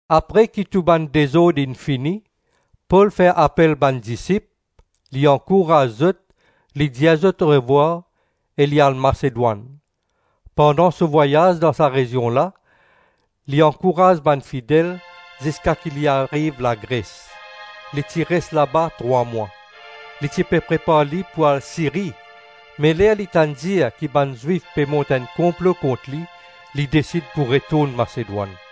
Apre ki tou bann dezord inn fini, Pol fer apel bann disip, li ankouraz zot, li dir zot orevwar, e li al Masedwann. Pandan so vwayaz dan sa rezion la li ankouraz bann fidel, ziska ki li ariv Lagres. Li ti res laba trwa mwa. Li ti pe prepar li pou al Siri, me ler li tann dir ki bann Zwif pe mont enn konplo kont li, li desid pou retourn Masedwann.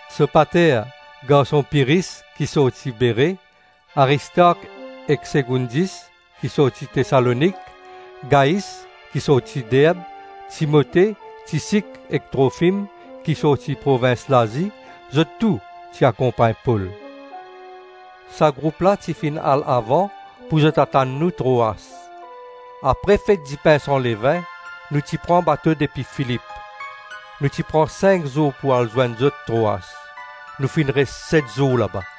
Sopater, garson Pyris ki sorti Bere, Aristark ek Segoundis ki sorti Tesalonik, Gais ki sorti Derb, Timote, Tisik ek Trofim ki sorti provins Lazi, zot tou ti akonpagn Pol. Sa group la ti finn al avan pou zot atann nou Troas. Apre fet dipin san levin, nou ti pran bato depi Filip. Nou ti pran sink zour pou al zwenn zot Troas. Nou finn res set zour laba.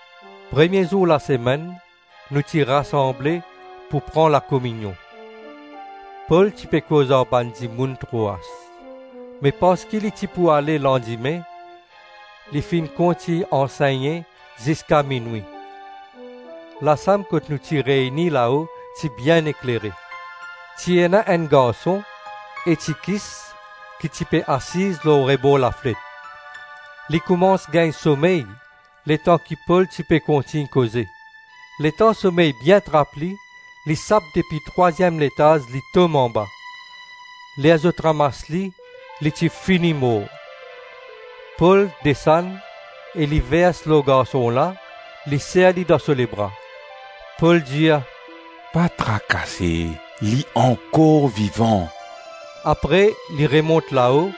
Premie zour lasemenn nou ti rasanble pou pran lakominion. Pol ti pe koz ar bann dimoun Troas. Me parski li ti pou ale landime, li finn kontign ansegne ziska minwi. Lasam kot nou ti reyni lao ti bien eklere. Ti ena enn garson, Etikis ki ti pe asiz lor rebor lafnet. Li koumans gagn somey letan ki Pol ti pe kontign koze. Letan somey bien trap li, li sap depi trwaziem letaz li tom anba. Ler zot ramas li, li ti fini mor. Pol desann e li vers lor garson la, li ser li dan so lebra. Pol dir, “Pa trakase, li ankor vivan.” Apre li remont lao,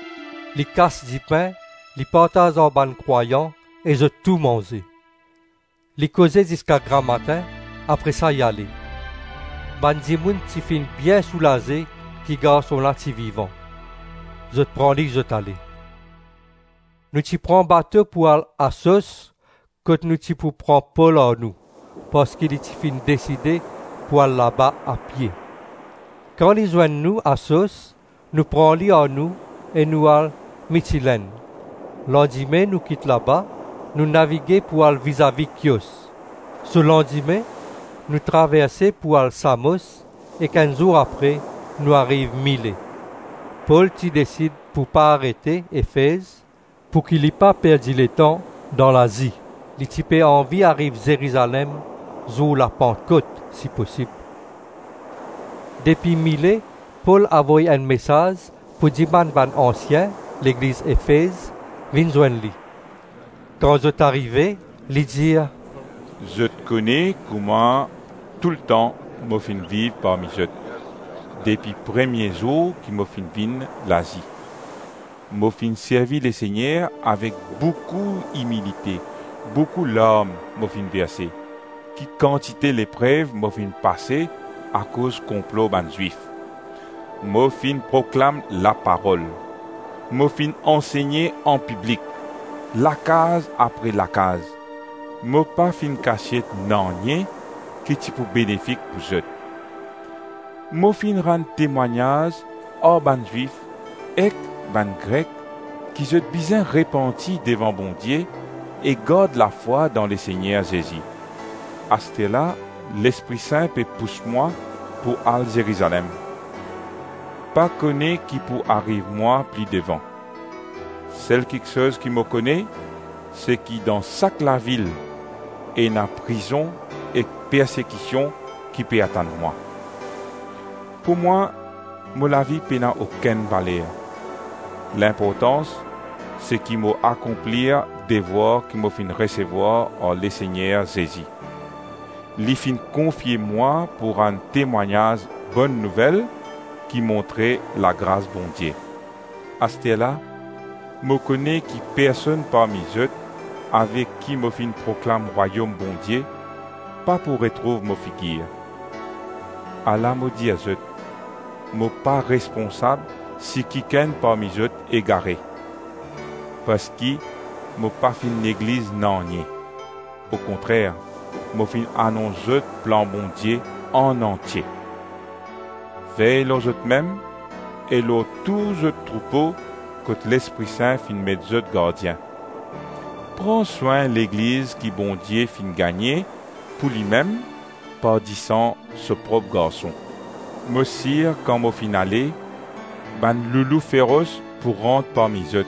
li kas dipin, li partaz ar bann krwayan e zot tou manze. Li koze ziska gramatin, apre sa li ale. Bann dimoun ti finn bien soulaze ki garson la ti vivan, zot pran li zot ale. Nou ti pran bato pou al Asos kot nou ti pou pran Pol ar nou, parski li ti finn deside pou al laba apie. Kan li zwenn nou Asos nou pran li ar nou e nou al Mitilenn. Landime nou kit laba, nou navige pou al vizavi Kios. So landime nou traverse pou al Samos, ek enn zour apre nou ariv Mile. Pol ti desid pou pa arete Efez pouki li pa perdi letan dan Lazi; li ti pe anvi ariv Zerizalem zour Lapantkot si posib. Depi Mile Pol avoy enn mesaz pou dimann bann ansien legliz Efez vinn zwenn li. Kan zot arive, li dir, “Zot kone kouma toultan mo finn viv parmi zot, depi premie zour ki mo finn vinn Lazi. Mo finn servi Lesegner avek boukou imilite; boukou larm mo finn verse, ki kantite leprev mo finn pase akoz konplo bann Zwif. Mo finn proklam laparol; mo finn ansegne anpiblik, lakaz apre lakaz; mo pa finn kasiet nanye ki ti pou benefik pou zot. Mo finn rann temwagnaz ar bann Zwif ek bann Grek ki zot bizin repanti devan Bondie e gard lafwa dan Lesegner Zezi. Aster la Lespri Sin pe pous mwa pou al Zerizalem. Pa kone ki pou ariv mwa pli devan. Sel kiksoz ki mo kone, seki dan sak lavil ena prizon ek persekision ki pe atann mwa. Pou mwa mo lavi pena okenn valer; linportans, seki mo akonplir devwar ki mo finn resevwar ar Lesegner Zezi. Li finn konfie mwa pou rann temwagnaz Bonn Nouvel ki montre lagras Bondie. Asterla mo kone ki personn parmi zot avek ki mo finn proklam Rwayom Bondie pa pou retrouv mo figir. Ala mo dir zot, mo pa responsab si kikenn parmi zot egare. Parski mo pa finn negliz nanye; okontrer mo finn anons zot plan Bondie anantie. Vey lor zotmem e lor tou zot troupo kot Lespri Sin finn met zot gardien. Pran swin Legliz ki Bondie finn gagne pou limem par disan so prop Garson. Mo sir kan mo finn ale, bann loulou feros pou rant parmi zot,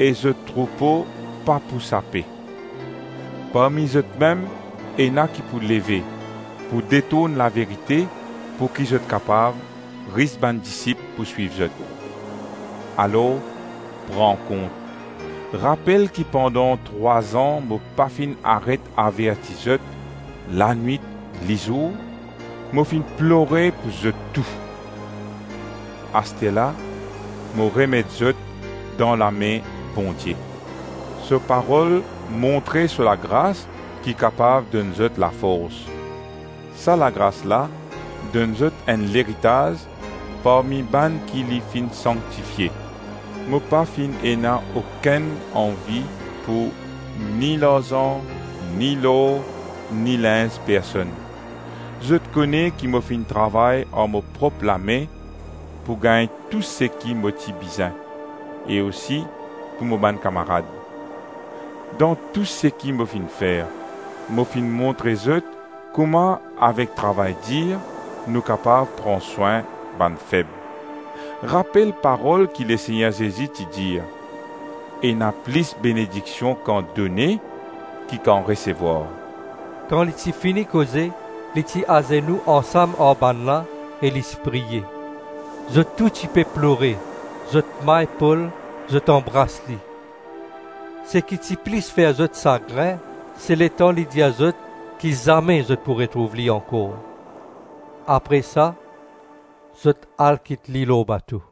e zot troupo pa pou sape. Parmi zotmem ena ki pou leve, pou detourn laverite pouki zot kapav ris bann disip pou swiv zot. Alors, pran kont! Rapel ki pandan trwa-zan mo pa finn aret averti zot lanwit-lizour, mo finn plore pou zot tou. Asterla mo remet zot dan lame Bondie. So parol montre so lagras ki kapav donn zot lafors. Sa lagras la donn zot enn leritaz parmi bann ki li finn sanktifie. Mo pa finn ena okenn anvi pou: ni larzan, ni lor, ni linz personn. Zot kone ki mo finn travay ar mo prop lame pou gagn tou seki mo ti bizin, e osi pou mo bann kamarad. Dan tou seki mo finn fer, mo finn montre zot kouma avek travay dir, nou kapav pran swin bann feb. Rapel parol ki Lesegner Zezi ti dir, ‘Ena plis benediksion kan done, ki kan resevwar.’” Kan li ti fini koze, li ti azenou ansam ar bannla e li ti priye. Zot tou ti pe plore, zot may Pol, zot anbras li. Seki ti plis fer zot sagrin, se letan li dir zot ki zame zot pou retrouv li ankor. Apre sa zot al kit li lor bato.